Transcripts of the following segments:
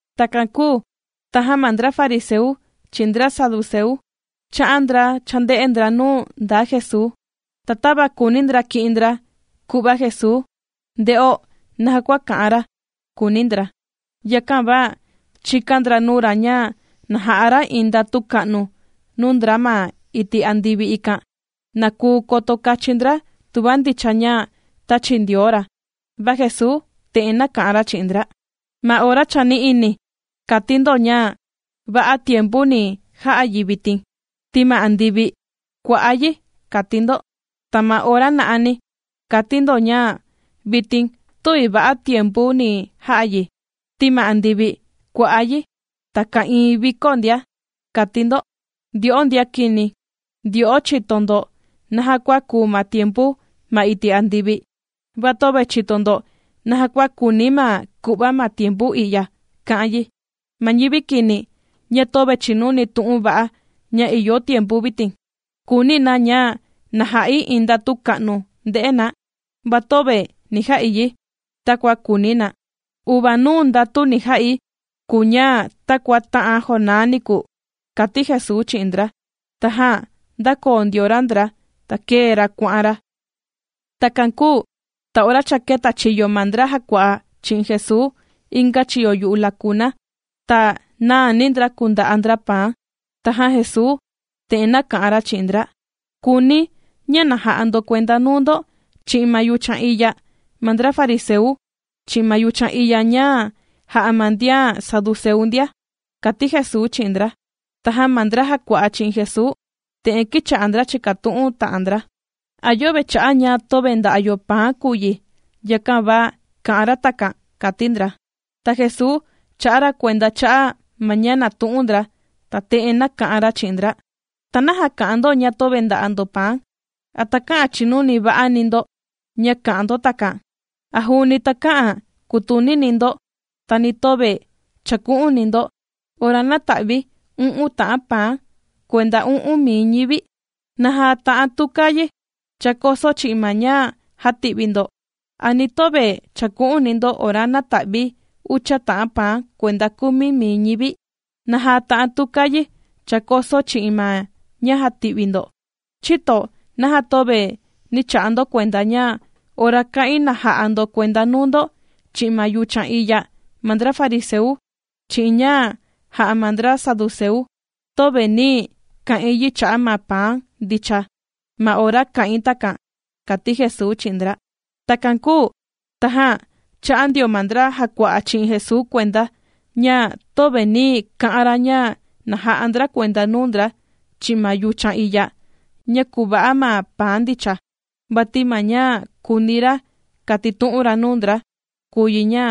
Takan kūu tajan ma ndra fariseu, chi'in ndra saduceu chā'an ndra chānde'e ndra nuu ndaa Jesuu. Ta tava kùuni ndra ki'in ndra ku'va Jesuu, nde'o naja kua ka'an ra, kùuni ndra. Yakan va chīkan ndra nuu ra ña na ja'a ra iin ndatu ka'nu nuu ndra ma iti' andivi, ikan na kuu koto kachin ndra tuva ndicha ña tāchi Ndioo ra. Va Jesuu te'en nāka'an ra chi'in ndra: ―Ma ora chani'ini, kàti ndo ña: “Va'a tiempu ni ja'a yi vitin, ti ma andivi kua'á yi”, kàti ndo. Ta ma ora na'ani, kàti ndo ña: “Vitin tüvi va'a tiempu ni ja'a yi, ti ma andivi kua'á yi, ta ka'ìin vikó ndia”, kàti ndo. ¡Ndyo'o ndian kini! Ndyo'o chìto ndo naja kua kùu ma tiempu ma iti' andivi, va töve chìto ndo naja kua kùuni ma ku'va ma tiempu i'ya ka'an yi. Ma ñivi kini, ña töve chìnuni tu'un va'a ña ìyo tiempu vitin, kùuni na ña na ja'i iin ndatu ka'nu nde'e na, va töve ni ja'i yi takua kùuni na. Uvanuu ndatu ni ja'i kùu ña takua tā'an Jonás niku ―kàti Jesuu chi'in ndra. Tajan ndākoo ndio ra ndra, ta kēe ra kuà'an ra. Takan kūu ta ora cha kētachiyo ma ndra jàkua'a chi'in Jesuu inga chiyo yu'u lakuna, ta nāani ndra kùnda'a ndra paan. Tajan Jesuu te'en nāka'an ra chi'in ndra: ―Kuuni̱, ña na ja'a ndo kuenda nuu ndo, chi'in ma yuchan iya ma ndra fariseu, chi'in ma yuchan iya ña jà'a ma ndian saduceu ndia ―kàti Jesuu chi'in ndra. Tajan ma ndra jàkua'a chi'in Jesuu te'en kīcha'a ndra chìkatu'un ta'an ndra: ―¿A yöve cha'a' ña töve nda'a yo paan kùu yi, yakan va kà'an ra takan? ―kàti ndra. Ta Jesuu chā'a ra kuenda cha'a' ma ña nàtu'un ndra, ta te'en nāka'an ra chi'in ndra: ―¿Ta naja kà'an ndo ña töve nda'a ndo paan? ¿A takä'an chinuni va'ani ndo ña kà'an ndo takan? ¿A juuni takä'an kutunini ndo, ta ni töve chàku'uni ndo, ora nāta'vi̱ u'un ta'an paan kuenda u'un mii ñivi? ¿Naja ta'an tuka yi chākoso chi'in ma ña jāti'vi ndo? ¿A ni töve chàku'uni ndo ora nāta'vi̱ ucha ta'an paan kuenda kumi mii ñivi? ¿Naja ta'an tuka yi chākoso chi'in ma ña jāti'vi ndo? ’¿Chïto naja töve nī cha'a ndo kuenda ña ora kā'in na ja'a ndo kuenda nuu ndo, chi'in ma yuchan iya ma ndra fariseu, chi'in ña jà'a ma ndra saduceu, töve nī ka'in yi cha'a' ma paan ndicha ma ora kā'in takan? ―kàti Jesuu chi'in ndra. Takan kūu tajan chā'a ndio ma ndra jàkua'a chi'in Jesuu kuenda ña, töve nī ka'an ra ña na jà'a ndra kuenda nuu ndra chi'in ma yuchan iya ña kùva'a ma paan ndicha, vati ma ña kūuni ra katitu'un ra nuu ndra, kùu yi ña,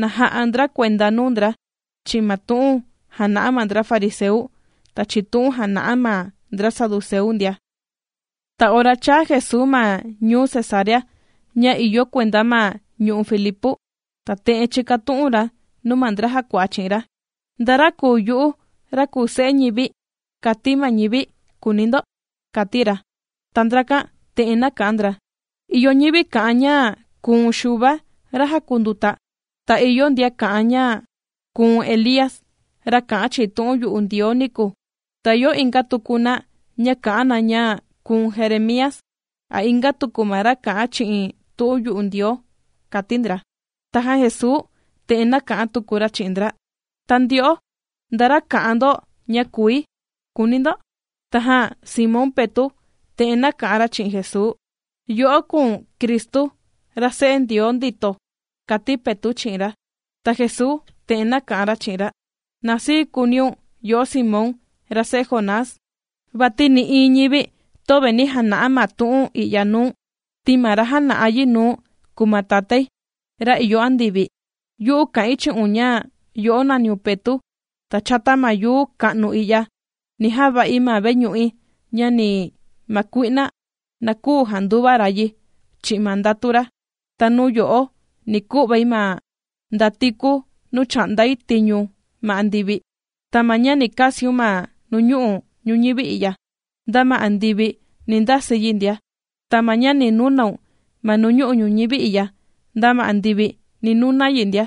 na ja'a ndra kuenda nuu ndra chi'in ma tu'un jàna'a ma ndra fariseu, ta chi'in tu'un jàna'a ma ndra saduceu ndia. Ta ora chāa Jesuu ma ñuu Cesarea ña ìyo kuenda ma ñu'u' Filipu. Ta te'en chīkatu'un ra nuu ma ndra jàkua'a chi'in ra: ―¿Nda ra kùu yu'u, ra kùu Se'e ñivi, kàti ma ñivi, kùuni ndo? ―kàti ra. Ta ndrakan te'en nāka'an ndra: ―Ìyo ñivi kà'an ña kùu̱n Xuva ra jàkunduta, ta ìyo ndian kà'an ña kùu̱n Elía, ra kā'an chi'in tu'un yu'u Ndioo niku. Ta ìyo inga tuku na ña kà'an na ña kùu̱n Jeremía, a inga tuku ma ra kà'an chi'in tu'un yu'u Ndioo ―kàti ndra. Tajan Jesuu te'en nāka'an tuku ra chi'in ndra: ―Ta ndyo'o, ¿nda ra kà'an ndo ña kùi?, kùuni ndo. Tajan Simón Petu' te'en nāka'an ra chi'in Jesuu: ―Yo'o kùu̱n Cristu, ra Se'e Ndioo ndito ―kàti Petu' chi'in ra. Ta Jesuu te'en nāka'an ra chi'in ra: ―Na sii kuuniun yo'o Simón, ra se'e Jonás, vati nï'iin ñivi töve nī jana'a ma tu'un i'ya nuu̱n, ti ma ra jāna'a yi nuu̱n kùu ma Tatái, ra ìyo andivi. Yu'u kà'in chi'un ña yo'o nàniun Petu', ta chata ma yuu ka'nu i'ya, ni java'i ma veñu'i, ña ni ma kui'na, na küu janduva ra yi chi'in ma ndatu ra. Ta nuu yo'o ni ku'vai ma ndatiku nuu chà'ndai tiñu ma andivi. Ta ma ña ni kasiun ma nuñu'u' ñuñivi i'ya, nda ma andivi ni ndasi yi ndia. Ta ma ña ni nunaun ma nuñu'u' ñuñivi i'ya, nda ma andivi ni nuna yi ndia.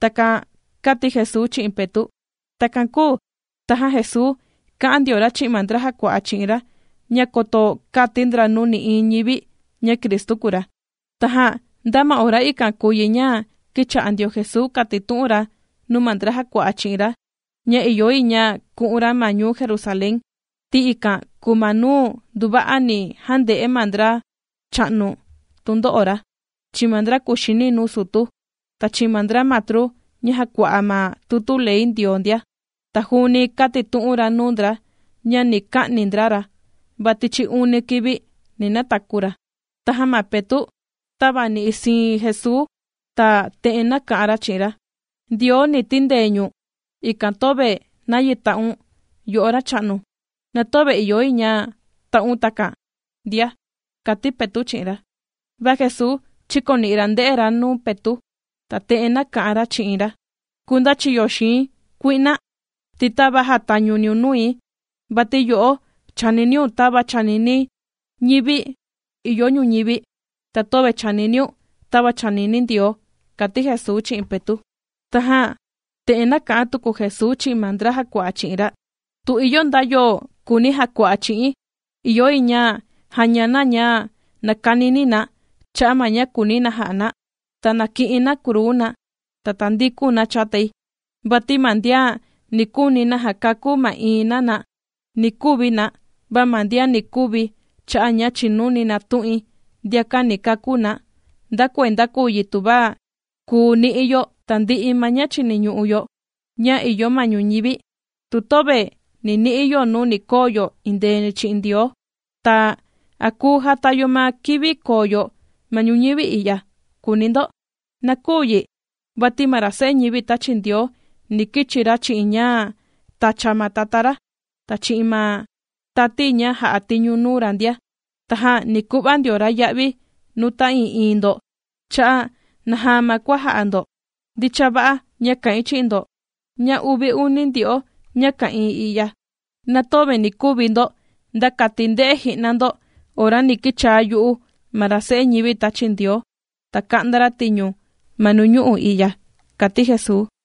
―Takan kāti Jesuu chi'in Petu'. Takan kūu tajan Jesuu kā'an ndio ra chi'in ma ndra jàkua'a chi'in ra ña koto käti ndra nuu nï'iin ñivi, ña Cristu kùu ra. Tajan nda ma ora ikan kùu yi ña kīcha'a ndio Jesuu kàtitu'un ra nuu ma ndra jàkua'a chi'in ra ña ìyo yi ña ku'un ra ma ñuu Jerusalén, ti ikan kùu ma nuu nduva'a ni jande'e ma ndracha'nu tundo'o ra, chi'in ma ndra kuxini nuu sutu, ta chi'in ma ndra matru ña jàkua'a ma tutu ley Ndioo ndia. Ta juuni kātitu'un ra nuu ndra ña ni ka'ni ndra ra, va tichi uni kivi, ni nataku ra. Tajan ma Petu', tāvani'i siin Jesuu, ta te'en nāka'an ra chi'in ra: ―Ndioo ni tindee ñu̱n, ikan töve nayi ta'un, yo'o Racha'nu. ¡Na töve ìyo yi ña ta'un takan ndia! ―kàti Petu' chi'in ra. Va Jesuu chīkoni'i ra ndē'e ra nuu Petu', ta te'en nāka'an ra chi'in ra: ―¡Kundachiyo xii̱n kui'na!, ti tava jàtañuniun nui. Vati yo'o chàniniun tava chànini ñivi ìyo ñuñivi, ta töve chàniniun tava chànini Ndioo ―kàti Jesuu chi'in Petu'. Tajan te'en nāka'an tuku Jesuu chi'in ma ndra jàkua'a chi'in ra: ―Tu ìyo nda yo kùuni jakua'a chi'i̱n, ìyo yi ña jaña na ña nakanini na cha'a ma ña kùuni na ja'a na, ta na ki'in na kruu na, ta tandikun na chatai. Vati ma ndian ni kuuni jakakú ma'iin na na, ni kuvi na. Va ma ndian ni kuvi cha'a' ña chìnuni na tu'in, ndiakan ni kakú na. ¿Nda kuenda kùu yi tuva kùu ni'i yo tandi'i ma ña chiniñu'u yo ña ìyo ma ñuñivi, tu töve ni ni'i yo nuu ni koo yo indeeni chi'in Ndioo? Ta, ¿a kùu jata yo ma kivi koo yo ma ñuñivi i'ya?, kùuni ndo. ¡Na küu yi! Vati ma ra Se'e ñivi tāchi Ndioo ni kichi ra chi'in ña tàcha ma Tatá ra, ta chi'in ma tati ña jà'a tiñu nuu ra ndia, tajan ni ku'va ndio ra ya'vi nuu ta'ii'iin ndo cha'a' naja ma kua jā'a ndo. Ndicha va'a, ña kà'in chi'in ndo, ña uvi uni ndyo'o ña ka'ìin i'ya, na töve ni kuvi ndo, nda kati nde'e ji'na ndo ora ni kichaa yu'u ma ra Se'e ñivi tāchi Ndioo, ta ka'nda ra tiñu ma nuñu'u' i'ya ―kàti Jesuu.